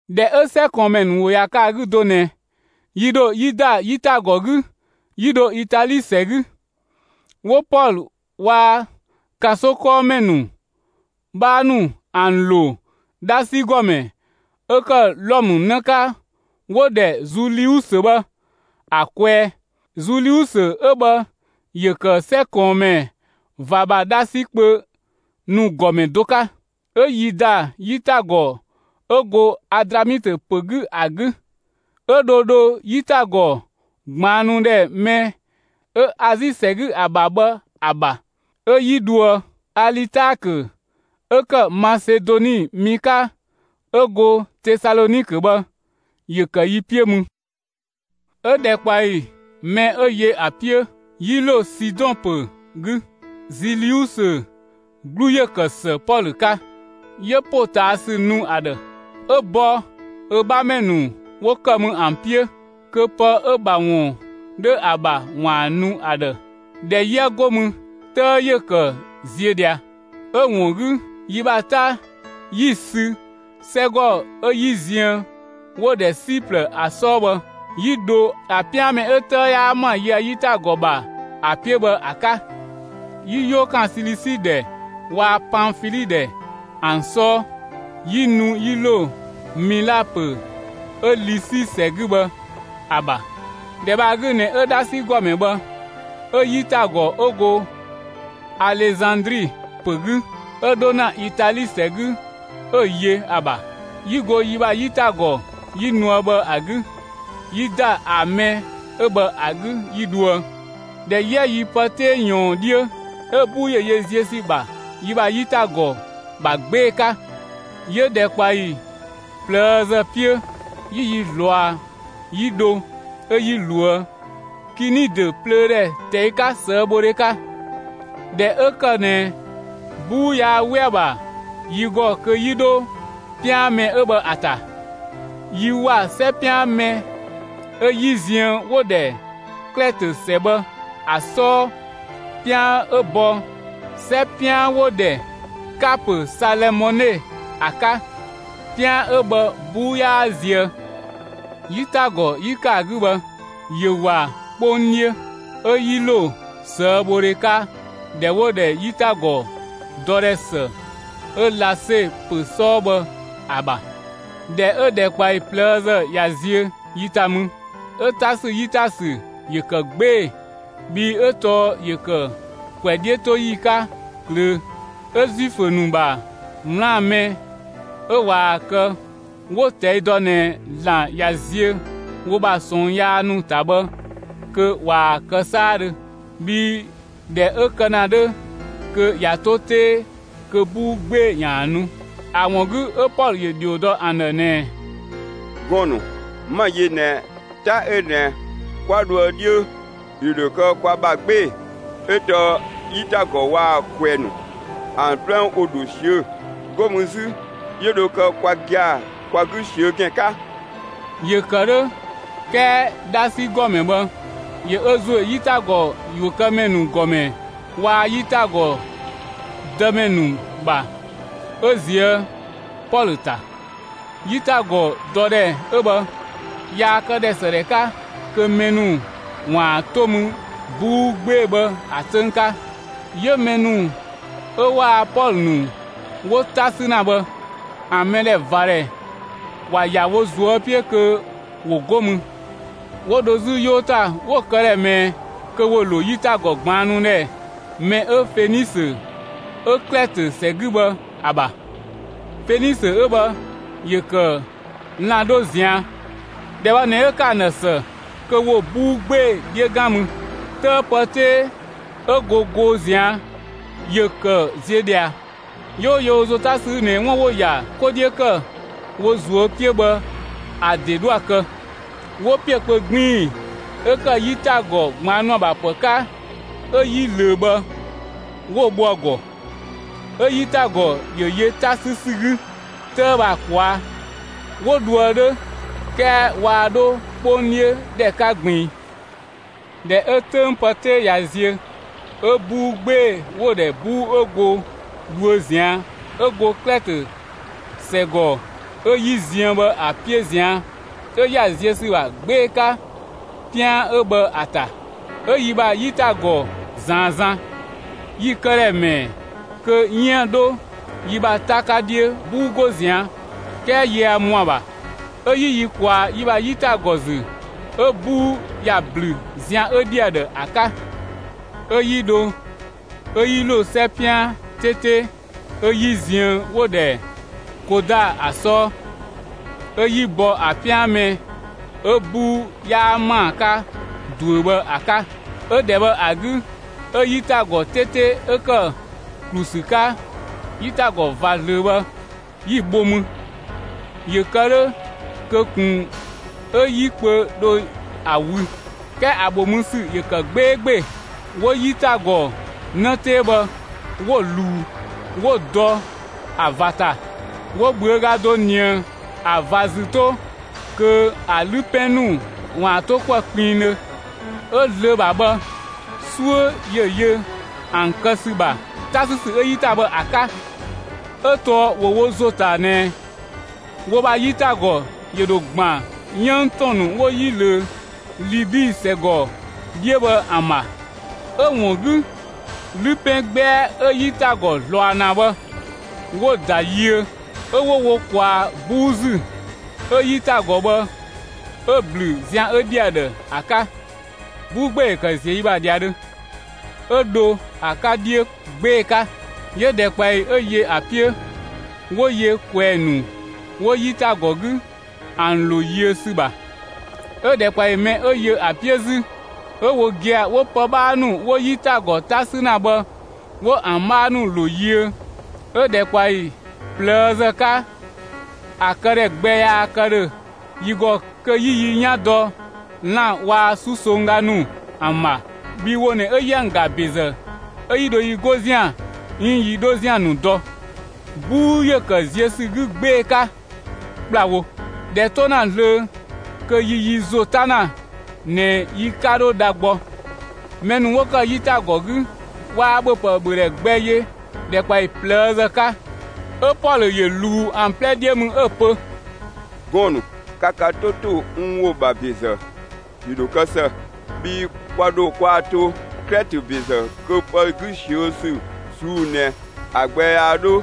꞊Dhɛ 'ö 'sɛ ꞊kɔɔnmɛ ‑nu ‑wo ꞊ya kë ‑a 'gü do ꞊nɛ, yi ‑dho 'yi ‑da 'yitagɔ 'gü 'yi dho Itali ‑sɛ 'gü, 'wo Pɔlö waa‑ ‑kanso 'kɔɔmɛ 'bhaa ‑nu ‑an ‑lo 'dhasi ‑gɔmɛ 'ö ‑kë Wlɔmë 'në 'ka 'wo‑ ‑dhɛ Zuliusö bhë ‑a kwɛɛ. Zuliusö 'ö bhë ‑yö ‑kë 'sɛ ꞊kɔɔnmɛ ꞊va ‑bha 'dhasi kpö ‑nu ‑gɔmɛ do 'ka. 'Ö 'yi ‑da 'yitagɔ 'ö go Adramitö ‑pö 'gü ‑a 'gü, 'ö dho dho 'yitagɔ ꞊gbaannu ‑dhɛ mɛ 'ö Azi ‑sɛ 'gü ‑a ‑bha bhë ‑a ‑bha, 'ö 'yi dhoë. Alitaakö 'ö ‑kë Masedoni mi 'ka 'ö go Tesalɔnikö bhë, ‑yö ‑kë yi 'piö mü. 'Ö ‑dhɛkpaɔyi mɛ 'ö yö ‑a 'piö, 'yi ‑lo Sidɔn ‑pö 'gü. Zuliusö 'glu ‑yö ‑kë ‑së Pɔlö 'ka; 'yö ‑potaasü nu ‑a ‑dhë, 'ö bɔ ö 'bhamɛ ‑nu 'wo ‑kë mü ‑an 'piö, kö pë 'ö‑ ‑bha ‑wun 'dhö ‑a ‑bha ‑waan ‑a nu ‑a ‑dhë. ꞊Dhɛ 'yië 'go mü, 'tëë ‑yö ‑kë ziö ꞊dhia. 'Ö‑ ‑wun 'gü, yi ‑bha 'ta 'yi‑ sü 'sɛgɔ 'ö 'yi ziën 'wo‑ ‑dhɛ Siplë ‑a 'sɔɔ bhë, 'yi dho ‑a 'pian mɛ 'ö 'tëë 'yaa ‑ma yië‑ 'yitagɔ ‑bha ‑a 'piö bhë ‑a 'ka. 'Yi 'yoo ‑kan Silisi ‑dhɛ waa‑ Panfili ‑dhɛ ‑an 'sɔɔ, 'yi nu 'yi ‑lo Mila ‑pö 'ö Lisi ‑sɛ 'gü bhë ‑a ‑bha. ‑Dhɛ bhë ‑a 'gü ꞊nɛ 'ö 'dhasi ‑gɔmɛ bhë 'ö 'yitagɔ 'ö go Alezandri ‑pö 'gü, 'ö 'dho ‑na Itali ‑sɛ 'gü 'ö‑ yö ‑a ‑bha. 'Yi go yi ‑bha 'yitagɔ 'yi nuë bhë ‑a 'gü, 'yi ‑da ‑a mɛ 'ö bhë ‑a 'gü 'yi dhoë. ꞊Dhɛ 'yië yi pë 'tee ꞊yɔɔn 'dhiö, 'ö 'buu ‑yö yö ziö ‑sü ‑bha yi ‑bha 'yitagɔ ‑bha 'gbee‑ 'ka. 'Yö ‑dhɛkpaɔyi ꞊plëëzë 'piö, 'yi yi ꞊zlɔa, 'yi dho 'ö 'yi ꞊loë' Kinidö plöö ‑dhɛ ꞊tɛi' 'ka, ꞊sëëbhodhe 'ka. ꞊Dhɛ 'ö ‑kë ꞊nɛ 'buu yaa 'we ‑a ‑bha yi ‑gɔ kö 'yi 'dho 'pian mɛ 'ö bhë ‑a ‑ta, yi ‑wa 'sɛ 'pian mɛ 'ö 'yi ziën 'wo‑ ‑dhɛ Klɛtö ‑sɛ bhë ‑a 'sɔɔ 'pian 'ö bɔ 'sɛ 'pian 'wo‑ ‑dhɛ Kapö Salëmɔne ‑a 'ka. 'Pian 'ö bhë 'buu 'yaa zië. 'Yitagɔ 'yi ‑kë ‑a 'gü bhë, ‑yö ‑wa 'kpong 'dhiö, 'ö 'yi ‑lo ꞊sëëbhodhe 'ka ‑dhɛ 'wo‑ ‑dhɛ 'yitagɔ ‑dɔdhɛ ‑së 'ö Lase ‑pö 'sɔɔ bhë ‑a ‑bha. ꞊Dhɛ 'ö ‑dhɛkpaɔyi ꞊plëëzë ꞊ya ziö yi ‑ta mü, 'ö 'ta ‑sü 'yi ‑ta ‑sü ‑yö ‑kë 'gbee‑, bhii 'ö tɔɔ ‑yö ‑kë ‑kwɛ 'dhiötoyi 'ka ꞊klöö'. 'Ö Zuifö ‑nu ‑bha 'wlaan‑ mɛ 'ö ꞊waa‑ kë 'wo‑ ꞊tɛi' dɔ ꞊nɛ ‑Zlan ꞊ya ziö wo ‑bha ꞊sɔɔn yaa ‑nu ‑ta bhë kö ꞊waa‑ kë 'saadhö. Bhii ꞊dhɛ 'ö kë ‑na 'dhö kö ꞊ya 'to 'tee kö 'buu 'gbee‑ ‑yaan nu. ‑A ‑wun 'gü, 'ö Pɔlö ‑yö ‑dhio dɔ ‑an ‑dhë ꞊nɛɛ: «Gɔɔn‑ ‑nu, 'ma‑ yö ꞊nɛ 'ta 'ö ꞊nɛ 'kwa dhoë 'dhiö, ‑yö ‑dho kë kwa ‑bha 'gbee‑, 'ö tɔɔ 'yitagɔ waa‑ ꞊kwɛɛ‑ ‑nu, ‑an 'plɛ ‑wo ‑dho ꞊siö, 'go mü 'zü, 'yö dho kë kwa gia‑ kwa 'gü ꞊siö'‑ ‑gɛn 'ka.» ‑Yö ‑kë 'dhö 'kɛɛ 'dhasi ‑gɔmɛ bhë ‑yö ö ‑zo ‑yö 'yitagɔ ‑yuökëmɛ ‑nu ‑gɔmɛ waa‑ 'yitagɔ dëmɛ ‑nu ‑bha 'ö ꞊zië' Pɔlö ‑ta. 'Yitagɔ ‑dɔdhɛ 'ö bhë yaa këdhɛ ‑së ‑dhɛ 'ka kö mɛ ‑nu ‑waan 'to mü 'buu 'gbee‑ bhë ‑a 'töng 'ka. 'Yö mɛ ‑nu 'ö waa‑ Pɔlö ‑nu 'wo 'ta ‑sü ‑na bhë ‑a mɛdhɛvadhɛ ‑wa ‑ya wo ꞊zuö' 'piö kö 'wo 'go mü, 'wo 'dho 'zü 'yoo ‑ta; 'wo‑ këdhɛ ꞊mɛɛ kö 'wo ‑lo 'yitagɔ ꞊gbaannu ‑dhɛ mɛ 'ö Fenisö 'ö Klɛtö ‑sɛ 'gü bhë ‑a ‑bha. Fenisö 'ö bhë ‑yö ‑kë lan‑ 'dho ꞊zian'. ‑Dhɛ bhë ꞊nɛ 'ö ‑kë ‑an ‑dhë ‑së kö 'wo 'buu 'gbee‑ 'dhiö 'gan mü. 'Tëë pë 'tee 'ö go goo ꞊zian' ‑yö ‑kë ziö ꞊dhia. 'Yö 'wo yö wo ‑zo 'ta ‑sü 'gü ꞊nɛ 'wun 'wo‑ ‑ya 'ko 'dhiö ‑kë wo ꞊zuö' 'piö bhë, ‑a ‑de 'dhoë‑ kë. 'Wo ‑piö kpö 'gbiin‑ 'ö ‑kë 'yitagɔ ꞊gbaannu ‑a ‑bha ‑pë 'ka, 'ö 'yi ꞊löö bhë 'wo‑ bho ‑a ‑gɔ, 'ö 'yitagɔ ‑yö yö 'ta 'sü ‑sü 'gü 'tëë bhë ‑a ꞊kwaa'. 'Wo dhoë 'dhö, 'kɛɛ waa 'dho 'kpong 'dhiö ‑dhɛ 'ka ꞊gbiin. ꞊Dhɛ 'ö 'töng pë 'tee ꞊ya ziö 'ö 'buu 'gbee‑ 'wo‑ ‑dhɛ 'buu 'ö go dhuö ꞊zian' 'ö go Klɛtö ‑sɛgɔ 'ö 'yi ziën bhë ‑a 'piö ꞊zian', 'ö ‑ya ziö ‑sü ‑bha 'gbee‑ 'ka 'pian 'ö bhë ‑a ‑ta. 'Ö yi ‑bha 'yitagɔ ‑zaan zan. Yi‑ këdhɛ ‑mɛɛ kö 'yiën‑ 'dho yi ‑bha 'ta 'ka 'dhiö 'buu 'go ꞊zian' 'kɛɛ yië ‑mɔa ‑bha. 'Ö 'yi yi ‑kwaa yi ‑bha 'yitagɔ ‑zü, 'ö 'buu ‑ya ‑blü zian 'ö 'dhi ‑a ‑dhë ‑a 'ka. 'Ö 'yi dho, 'ö 'yi ‑lo 'sɛ 'pian 'tete 'ö 'yi ziën 'wo‑ ‑dhɛ Koda ‑a 'sɔɔ. 'Ö 'yi bɔ ‑a 'pian mɛ 'ö 'buu 'yaa ‑maa 'ka ꞊duö bhë ‑a 'ka. 'Ö ‑dhɛ bhë ‑a 'gü 'ö 'yitagɔ 'tete 'ö ‑kë ‑klu ‑sü 'ka 'yitagɔ ꞊va ꞊zlöö bhë, 'yi‑ bho mü, ‑yö kë 'dhö kö ꞊kun 'ö 'yi kpö dho a wü; 'kɛɛ ‑a ‑bho mü ‑sü ‑yö ‑kë 'gbeegbee. 'Wo 'yitagɔ 'në 'tee bhë 'wo‑ ꞊luu, 'wo‑ dɔ ‑a ꞊va ‑ta. 'Wo ꞊bhüöga do ‑nië ‑a ꞊va ‑zü 'to kö ‑a 'lü 'pɛn ‑nu ‑waan to 'kuë‑ kpinngdhö. 'Ö zlöö ‑bha bhë, 'suö ‑yö yö ‑an ‑kë ‑sü ‑bha 'ta 'sü ‑sü 'ö 'yi ‑ta bhë ‑a 'ka. 'Ö tɔɔ ‑wo wo ‑zo ‑ta ꞊nɛɛ wo ‑bha 'yitagɔ ‑yö ‑dho ‑gban 'yënng ‑tɔn ‑nu 'wo 'yi ꞊löö Libi ‑sɛgɔ 'dhiö bhë ‑an ‑bha. 'Ö‑ ‑wun 'gü, 'wo 'lü 'pɛn 'gbɛa 'ö 'yitagɔ ꞊zlɔa ‑na bhë, 'wo‑ ‑da yiö. 'Ö 'wo wo ‑kwaa 'buu ‑zü, 'ö 'yitagɔ bhë 'ö‑ ‑blü zian 'ö 'dhi ‑a ‑dhë ‑a 'ka. 'Buu 'gbee‑ ‑yö ‑kë ‑ziö yi ‑bha ‑dhiadhö, 'ö dho ‑a 'ka 'dhiö 'gbee‑ 'ka. 'Yö ‑dhɛkpaɔyi 'ö yö ‑a 'piö, 'wo yö ꞊kwɛɛ‑ ‑nu 'wo 'yitagɔ 'gü, ‑an ‑lo yiö ‑sü ‑bha. 'Ö ‑dhɛkpaɔyi mɛ 'ö yö ‑a 'piö 'zü, 'ö wo gia‑ 'wo pë 'bhaa ‑nu 'wo 'yitagɔ 'ta 'sü ‑na bhë 'wo ‑an 'bhaa ‑nu ‑lo yiö. 'Ö ‑dhɛkpaɔyi ꞊plëëzë 'ka, ‑a këdhɛ gbɛ yaa kë ‑dhö yi ‑gɔ kö 'yi yi 'yan dɔ lan‑ waa‑ 'susongga ‑nu ‑an ‑bha; bhii wo ꞊nɛ 'ö 'yië ‑an ga ‑bezë 'ö yi dho yi 'go ‑zian 'iin yi 'dho ‑zian ‑nu dɔ. 'Buu ‑yö ‑kë ziö ‑sü 'gü 'gbee‑ 'ka ‑kplawo; ꞊dhɛ 'to ‑na zlöö kö yi yi ‑zo 'ta ‑na ꞊nɛ yi 'ka 'dho dha gbɔ. Mɛ ‑nu 'wo ‑kë 'yitagɔ 'gü waa ‑bhöpë ‑bhödhɛ gbɛ yö ‑dhɛkpaɔyi ꞊plëëzë 'ka. 'Ö Pɔlö ‑yö ꞊luu ‑an 'plɛ 'dhiö mü, 'ö‑ pö: «Gɔɔn‑ ‑nu, ka ka 'to ‑to n ‑wo ‑bha ‑bezë, ‑yö ‑dho kë ‑së; bhii kwa dho kwaa‑ to Klɛtö ‑bezë kö pë 'gü ꞊siö' ‑sü ꞊suu'‑ ꞊nɛ ‑a gbɛ yaa 'dho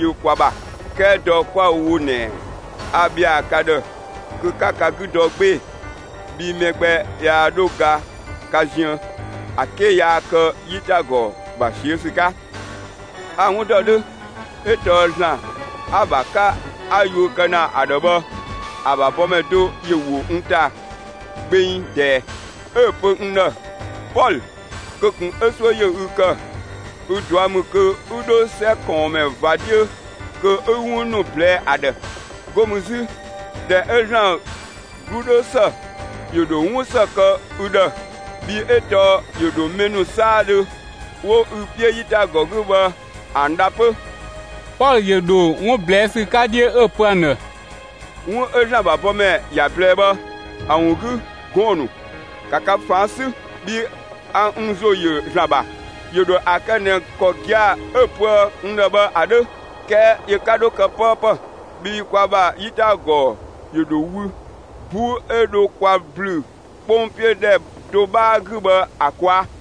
yö kwa ‑bha. 'Kɛɛ dɔ 'kwa‑ wo ꞊nɛ, a ‑bhɛa ka ‑dhë kö 'ka ka 'gü dɔ 'gbee‑, bhii mɛ gbɛ yaa 'dho ga ka ziën, ‑a 'ke yaa kë 'yitagɔ ‑bha ꞊siö' ‑sü 'ka. A‑ 'wun ‑dɔ 'dhö 'ö tɔɔ ‑Zlan 'a‑ ‑bha 'ka 'a yuö kë ‑na ‑a ‑dhë bhë, ‑a ‑bha bɔmɛ do ‑yö ‑wo n ‑ta gbeng ꞊dɛɛ, 'ö‑ pö n ‑dhë: ‹Pɔlö, kö ꞊kun 'ö 'suö ‑yö ü ‑kë, ü ꞊dua' ‑mü kö 'ü 'dho 'sɛ ꞊kɔɔnmɛ ꞊va 'dhiö kö 'ü 'wun ‑nu ꞊blɛɛ'‑ ‑a ‑dhë. 'Go mü 'zü, ꞊dhɛ 'ö ‑Zlan 'glu 'dhö ‑së, ‑yö ‑dho 'wun ‑së kë ü ‑dhë, bhii 'ö tɔɔ ‑yö ‑dho mɛ ‑nu 'saadhö 'wo ü 'piö 'yitagɔ 'gü bhë, ‑an ‑dha 'pö.›» Pɔlö ‑yö ‑dho 'wun ꞊blɛɛ' ‑sü 'ka 'dhiö 'ö‑ pö ‑an ‑dhë: «'Wun 'ö ‑Zlan ‑bha bɔmɛ ‑ya ꞊blɛɛ bhë ‑a ‑wun 'gü, gɔɔn‑ ‑nu, ‑ka ka ꞊faan' 'sü, bhii a n ‑zo ‑yö ‑Zlan ‑bha; ‑yö ‑dho ‑a kë ꞊nɛ ‑kɔ gia‑ 'ö‑ pöë n ‑dhë bhë ‑a 'dhö. 'Kɛɛ yö 'ka 'dho kë 'pëëpë, bhii kwa ‑bha 'yitagɔ ‑yö ‑dho wü 'buu 'ö dho kwa ‑blü 'kpong 'piö ‑dhɛ do 'bhaa 'gü bhë ‑a ꞊kwaa'.»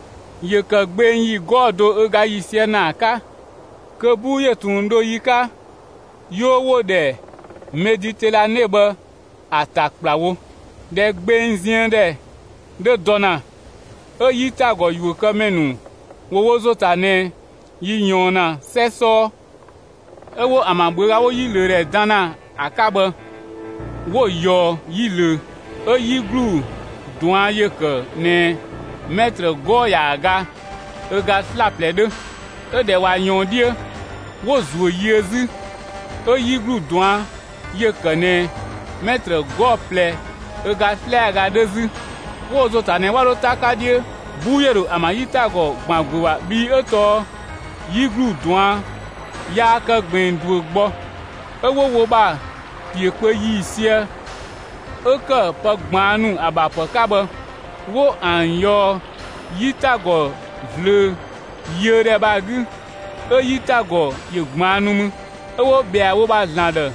‑Yö ‑kë gbeng ‑yi 'gɔɔ‑ do ö ga ‑yiisië ‑naa 'ka, kö 'buu ‑yö ꞊tun dho yi 'ka, 'yoo 'wo‑ ‑dhɛ Meditɛlane bhë ‑a ‑ta ‑kplawo. ꞊Dhɛ gbeng ziën ‑dhɛ 'dhö dɔ ‑na, 'ö 'yitagɔ ‑yuökëmɛ ‑nu ‑wo wo ‑zo ‑ta ꞊nɛ yi ꞊yɔɔn ‑na 'sɛ 'sɔɔ. 'Ö 'wo ‑an ‑bha ꞊bhüöga 'wo 'yi ꞊löö ‑dhɛ dan ‑na ‑a 'ka bhë, 'wo‑ ꞊yɔɔ 'yi ꞊löö, 'ö 'yi ‑glu ꞊duan' ‑yö ‑kë ꞊nɛɛ 'mɛtrë 'gɔɔ‑ ‑yaaga ö ga 'slaplɛ 'dhö. 'Ö ꞊dhɛ ꞊wa ꞊yɔɔn 'dhiö, 'wo‑ ‑zuö yiö 'zü, 'ö 'yi ‑glu ꞊duan' ‑yö ‑kë ꞊nɛɛ 'mɛtrë 'gɔɔ‑ ꞊plɛ ö ga 'slɛaga 'dhö 'zü. ‑Wo wo ‑zo ‑ta ꞊nɛ 'wa 'dho 'ta 'ka 'dhiö 'buu ‑yö ‑dho ‑an ‑bha 'yitagɔ ‑gban ‑guö ‑bha bhii 'ö tɔɔ 'yi ‑glu ꞊duan' yaa kë ꞊gbiin ꞊duö gbɔ. 'Ö 'wo wo ‑bha ‑piö kpö ‑yiisië 'ö ‑kë pë ꞊gbaannu ‑a ‑bha ‑pë 'ka bhë 'wo ‑an ꞊yɔɔ 'yitagɔ ꞊zlöö yiö ‑dhɛ bhë ‑a 'gü 'ö 'yitagɔ ‑yö ꞊gbaannu mü. 'Ö 'wo ꞊bhɛa wo ‑bha ‑zlan ‑dhë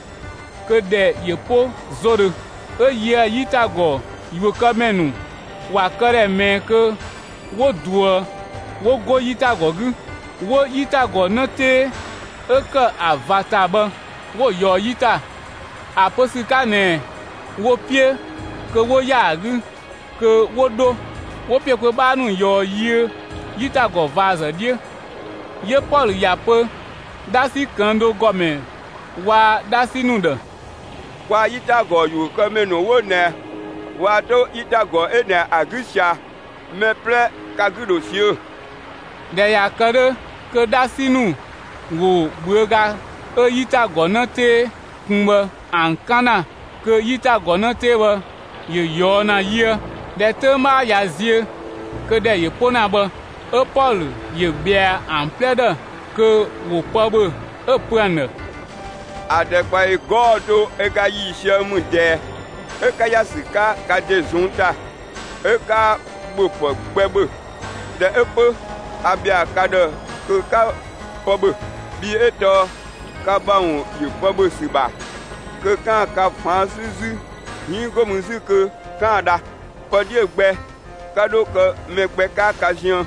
kö ‑dhɛ ‑yö 'po 'zodhö. 'Ö yië‑ 'yitagɔ ‑yuökëmɛ ‑nu ‑wa këdhɛ ‑mɛɛ kö 'wo ꞊duë 'wo 'go 'yitagɔ 'gü. 'Wo 'yitagɔ 'në 'tee 'ö ‑kë ‑a ꞊va ‑ta bhë 'wo‑ ꞊yɔɔ 'yi ‑ta, ‑a pö ‑sü 'ka ꞊nɛɛ wo‑ 'piö kö 'wo ‑ya ‑a 'gü kö 'wo 'dho, 'wo ‑piö kpö 'bhaa ‑nu ꞊yɔɔ'‑ yiö 'yitagɔ ꞊vazë 'dhiö. 'Yö Pɔlö ‑ya pö 'dhasi ꞊këng' do ‑gɔmɛ waa‑ 'dhasi ‑nu ‑dhë: «Kwaa‑ 'yitagɔ ‑yuökëmɛ ‑nu 'wo ꞊nɛ waa 'to 'yitagɔ 'ö ꞊nɛ ‑a 'gü ꞊sia, mɛ 'plɛ ka 'gü ‑dho ꞊siö'‑.» ꞊Dhɛ ꞊ya kë 'dhö kö 'dhasi ‑nu ‑wo ꞊bhüöga 'ö 'yitagɔ 'në 'tee kun bhë ‑an 'kan ‑na kö 'yitagɔ 'në 'tee bhë ‑yö ꞊yɔɔ' ‑na yiö. ꞊Dhɛ 'töng 'bhaa ꞊ya ziö, kö ‑dhɛ ‑yö 'po ‑na bhë, 'ö Pɔlö ‑yö ꞊bhɛa ‑an 'plɛ ‑dhë kö ‑wo pë ‑bhö, 'ö‑ pö ‑an ‑dhë: «‑A ‑dhɛkpaɔyi 'gɔɔ‑ do ö ga ‑yiisië ‑mü ꞊dɛɛ, 'ö 'ka ‑ya ‑sü 'ka ka ‑de ꞊zɔnng' ‑ta, 'ö 'kaa ‑bhöpë gbɛ ‑bhö. ꞊Dhɛ 'ö 'pö, 'a ‑bhɛa ka ‑dhë kö 'ka pë ‑bhö. Bhii 'ö tɔɔ ka ‑bha ‑wun ‑yö pë ‑bhö ‑sü ‑bha kö 'kaan‑ ka ꞊faan' 'sü 'zü 'iin 'go mü 'zü kö 'kaan‑ dha. Pë 'dhiö‑ gbɛ 'ka 'dho kë mɛ gbɛ 'ka ka ziën.»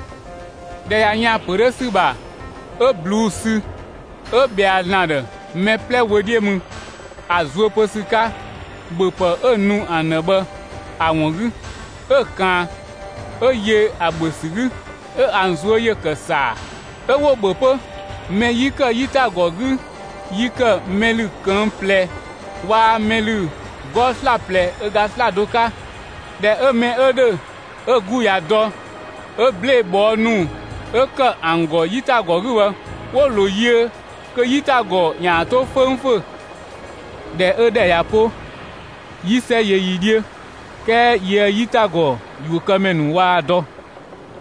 ꞊Dhɛ ꞊ya yën ‑a ‑pö 'dhö ‑sü ‑bha, 'ö ꞊bluu'‑ sü, 'ö ‑bhɛa ‑Zlan ‑dhë mɛ 'plɛ wö 'dhiö mü, ‑a zuö pö ‑sü 'ka ‑bhöpë 'ö‑ nu ‑an ‑dhë bhë ‑a ‑wun 'gü. 'Ö‑ ꞊kaan, 'ö yö ‑a ‑bhö ‑sü 'gü. 'Ö ‑an ꞊zuö' ‑yö ‑kë ‑saa, 'ö 'wo‑ ‑bhö 'pö. Mɛ 'yi ‑kë 'yitagɔ 'gü yi ‑kë mɛ ‑lü ꞊këng' ꞊plɛ waa‑ mɛ ‑lü 'gɔɔ‑ 'slaplɛ ö ga 'slado 'ka. ꞊Dhɛ 'ö mɛ 'ö ‑dhö 'ö‑ 'gü ꞊ya dɔ, 'ö 'blee‑ ꞊bhɔɔ' ‑nu 'ö ‑kë ‑an ‑gɔ 'yitagɔ 'gü bhë, 'wo‑ ‑lo yiö kö 'yitagɔ ‑yaan 'to 'föngfö. ꞊Dhɛ 'ö ‑dhɛ ꞊ya 'po, 'yi 'sɛ yö yi 'dhiö, 'kɛɛ yië‑ 'yitagɔ ‑yuökëmɛ ‑nu waa‑ dɔ.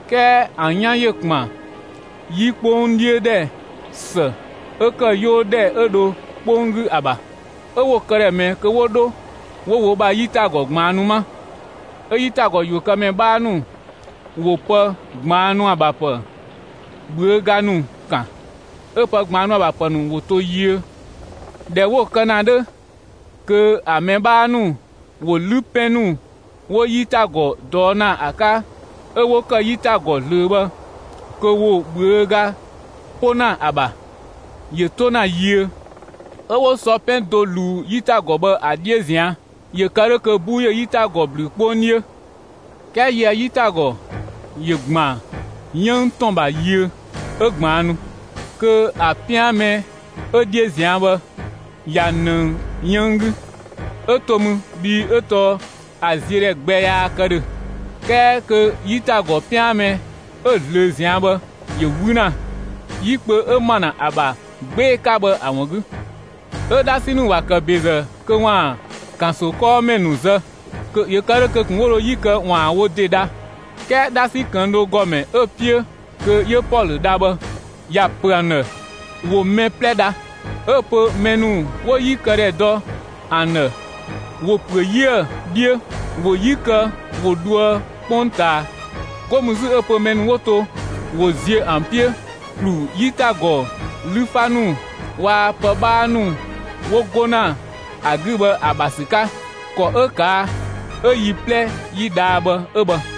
'Kɛɛ ‑an 'yan ‑yö ‑kpan 'yi 'kpong 'dhiö ‑dhɛ ‑së 'ö ‑kë 'yoo ‑dhɛ 'ö dho 'kpong 'gü ‑a ‑bha. 'Ö 'wo‑ këdhɛ ꞊mɛɛ kö 'wo 'dho 'wo wo ‑bha 'yitagɔ ꞊gbaannu 'ma. 'Ö 'yitagɔ ‑yuökëmɛ 'bhaa ‑nu ‑wo pë ꞊gbaannu ‑a ‑bha ‑pë ꞊bhüöga ‑nu ‑kan, 'ö pë ꞊gbaannu ‑a ‑bha ‑pë ‑nu ‑wo to yiö. ꞊Dhɛ 'wo‑ kë ‑na 'dhö kö ‑a mɛ 'bhaa ‑nu ‑wo 'lü 'pɛn ‑nu 'wo 'yitagɔ ꞊dɔɔ' ‑na ‑a 'ka 'ö 'wo ‑kë 'yitagɔ ꞊zlöö bhë kö ‑wo ꞊bhüöga 'po ‑na ‑a ‑bha, ‑yö 'to ‑na yiö. 'Ö 'wo sɔ 'pɛn do ꞊luu 'yitagɔ bhë ‑a 'dhiö ꞊zian', ‑yö kë 'dhö kö 'buu ‑yö 'yitagɔ ‑blü 'kpong 'dhiö. 'Kɛɛ yië‑ 'yitagɔ ‑yö ‑gban 'yënng ‑tɔn ‑bha yiö, 'ö ꞊gbaannu; kö ‑a 'pian mɛ 'ö 'dhiö zian bhë ꞊ya ꞊nëng 'yënng 'gü. 'Ö to mü, bhii 'ö tɔɔ ‑a ziödhɛ gbɛ yaa kë ‑dhö. 'Kɛɛ kö 'yitagɔ 'pian mɛ 'ö ꞊zlöö ꞊zian' bhë ‑yö 'wü ‑na, 'yi kpö 'ö ma ‑na ‑a ‑bha 'gbee‑ 'ka bhë ‑a ‑wun 'gü. 'Ö 'dhasi ‑nu ‑wa ‑kë ‑bezë kö ‑waan ‑kanso 'kɔɔmɛ ‑nu zë, ‑yö kë 'dhö kö ꞊kun 'wo dho 'yi kë ‑waan wo ‑de dha. 'Kɛɛ 'dhasi ꞊këng' do ‑gɔmɛ 'ö‑ 'piö kö 'yö Pɔlö dha bhë, ‑ya ‑pö ‑an ‑dhë ‑wo mɛ 'plɛ dha. 'Ö‑ pö mɛ ‑nu 'wo 'yi kë ‑dhɛ dɔ ‑an ‑dhë, ‑wo ‑püö 'yië‑ 'dhiö, ‑wo 'yi kë ‑wo dhoë 'kpongtaa. 'Go mü 'zü 'ö‑ pö mɛ ‑nu 'wo to ‑wo ziö ‑an 'piö ‑klu 'yitagɔ 'lü 'fa ‑nu waa‑ pë 'bhaa ‑nu 'wo 'go ‑na ‑a 'gü bhë ‑a ‑bha ‑sü 'ka. ‑Kɔ 'ö ꞊kaa' 'ö yi 'plɛ 'yi dhaa bhë 'ö bhë.